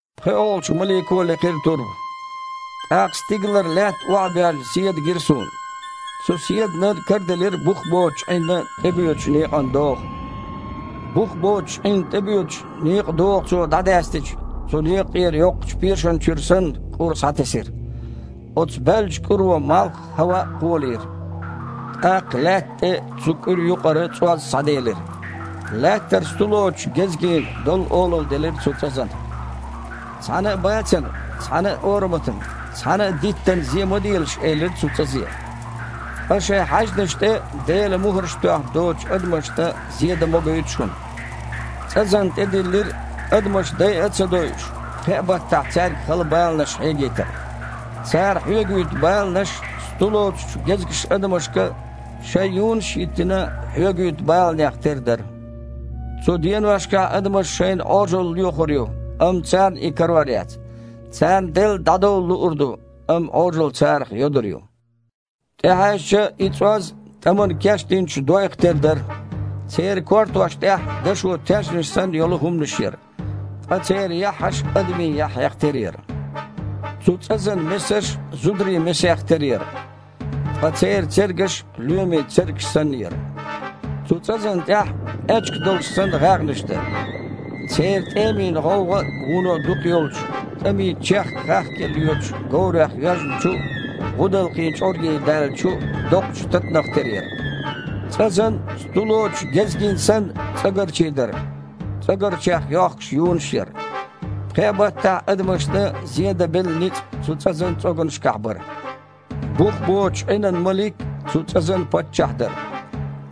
ПхоьалгІачу малико а лекхира турба. ТІаккха стигалара лаьтта охьабоьжна седа гира суна. Цу седанан караделира бух боцучу Іинна тІебоьдучу некъан догІа. Бух боцучу Іинна тІебоьдучу некъан догІа цо дІадаьстича, цу некъа тІера, йоккхачу пешана чуьра санна, кІур схьатесира. Оцу баьллачу кІуьро малх а, хІаваъ а кхолийра. ТІаккха лаьтта тІе цу кІуьра юкъара цІоз схьаделира. Лаьттара сту лоцучу гезгийн доллу олалла делира цу цІазана. Цхьана а бацана, цхьана а ораматна, цхьана а диттана зен ма делаш, элира цу цІазе. Ткъа шайн хьаьжнаш тІе Делан мухІарш тоьхна доцучу адамашна зен дан могуьйту шуна. ЦІазана тІедиллира, адамаш дайа а ца дойуш, пхеа баттахь цаьрга хала баланаш хьегийтар. Цара хьоьгуьйту баланаш сту лоцучу гезгаша адамашка, шайн юнаш а йиттина, хьоьгуьйту баланех тера дара. Цу деношкахь адамаша шайна Іожалла лоьхур ю, амма царна и карор яц. Царна делла дІадовла луур ду, амма Іожалла царах йодур ю. ТІехьаьжча, и цІоз тІамана кечдинчу дойх тера дара. Церан кортош тІехь дашо таьжнаш санна йолу хІуманаш яра. Ткъа церан яххьаш адамийн яххьех тера яра. Цу цІазан месаш а зударийн месех тера яра. Ткъа церан цергаш лоьмийн цергаш санна яра. Цу цІазана тІехь, аьчка долуш санна, гІаьгІнаш дара. Церан тІемийн гІовгІа вуно дукха йолчу, тІаме чехка хахкаелла йоьдучу говрех йоьжначу гІудалкхийн чкъургийн даьллачу доккхачу татанах тера яра. ЦІазан, сту лоцучу гезгийн санна, цІогарчий дара, цІогарчех йохкуш юнаш яра. Пхеа баттахь адамашна зен дан белла ницкъ цу цІазан цІоганашкахь бара. Бух боцучу Іинан малик цу цІазан паччахь дара.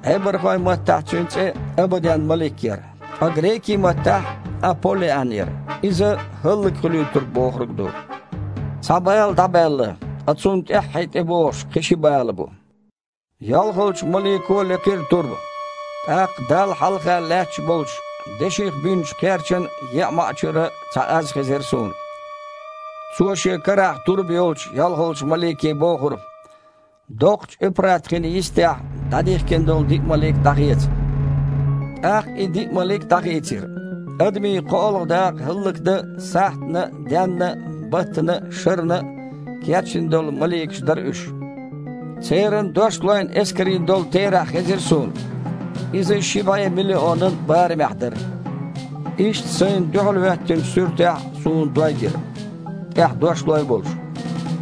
Іебархойн маттахь цуьнан цІе Абаден-малик яра, ткъа грекийн маттахь Аполлиан яра (иза «хІаллакьхуьлуьйтург» бохург ду). Цхьа бала дІабаьлла. Ткъа цунна тІаьххье тІебогІуш кхин а ши бала бу. ЙолхалгІачу малико а лекхира турба. ТІаккха Далла хьалха лаьтташ болчу деших бинчу кхерчан еа маІа чуьра цхьа аз хезира суна. Цо шен карахь турба йолчу йолхалгІачу малике бохура: «Доккхачу Эпрат-хина йистехь дІадихкина долу диъ малик дІахеца!» ТІаккха и диъ малик дІахийцира. Адамийн кхоалгІа дакъа хІаллакдан сахьтана а, денна а, баттана а, шарна а кечдина долу маликаш дара уьш. Церан дошлойн эскарийн долу терахь хезира суна. Иза ши бІе миллионан барамехь дара. Иштта сайна дуьхьалхІоьттинчу суьртехь суна дой гира, тІехь дошлой а болуш.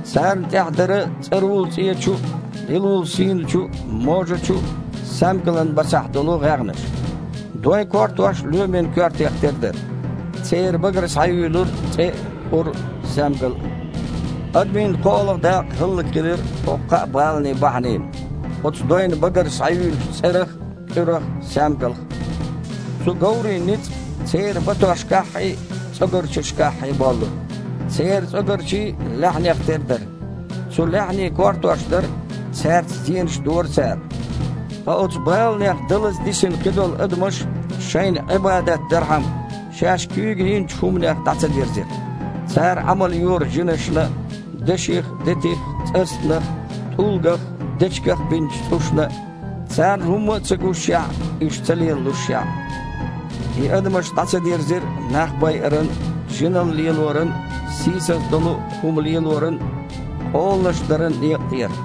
Царна тІехь дара цІарула-цІечу а, лилула-сийначу а, можачу саьмгалан а басахь долу гІаьгІнаш. Дойн кортош лоьмийн коьртех тера дара. Церан багара схьаюьйлура цІе а, кІур а, саьмгал а. Адамийн кхоалгІа дакъа хІаллакьхилира хІокху кхаа баланан бахьанина: оцу дойн багара схьаюьйлучу цІерах а, кІуьрах а, саьмгалх а. Цу говрийн ницкъ церан батошкаххьий, цІогарчашкаххьий боллура. Церан цІогарчий лаьхьанех тера дара. Цу лаьхьанийн кортош дара, цаьрца зенаш дора цара. Ткъа оцу баланех далаза дисина кхидолу адамаш, шайна Іибадат дархьама, шаьш куьйга йинчу хІуманех дІа ца дирзира. Цара Іамал йора жинашна а, деших а, детих а, цІастанах а, тІулгах а, дечигах а бинчу цІушна а, царна хІумма а ца гушшехь а, уьш ца лелалушшехь а. И адамаш дІа ца дирзира нах байаран а, жиналла лелоран а, сийсаза долу хІума лелоран а, къоланаш даран а некъа тІера.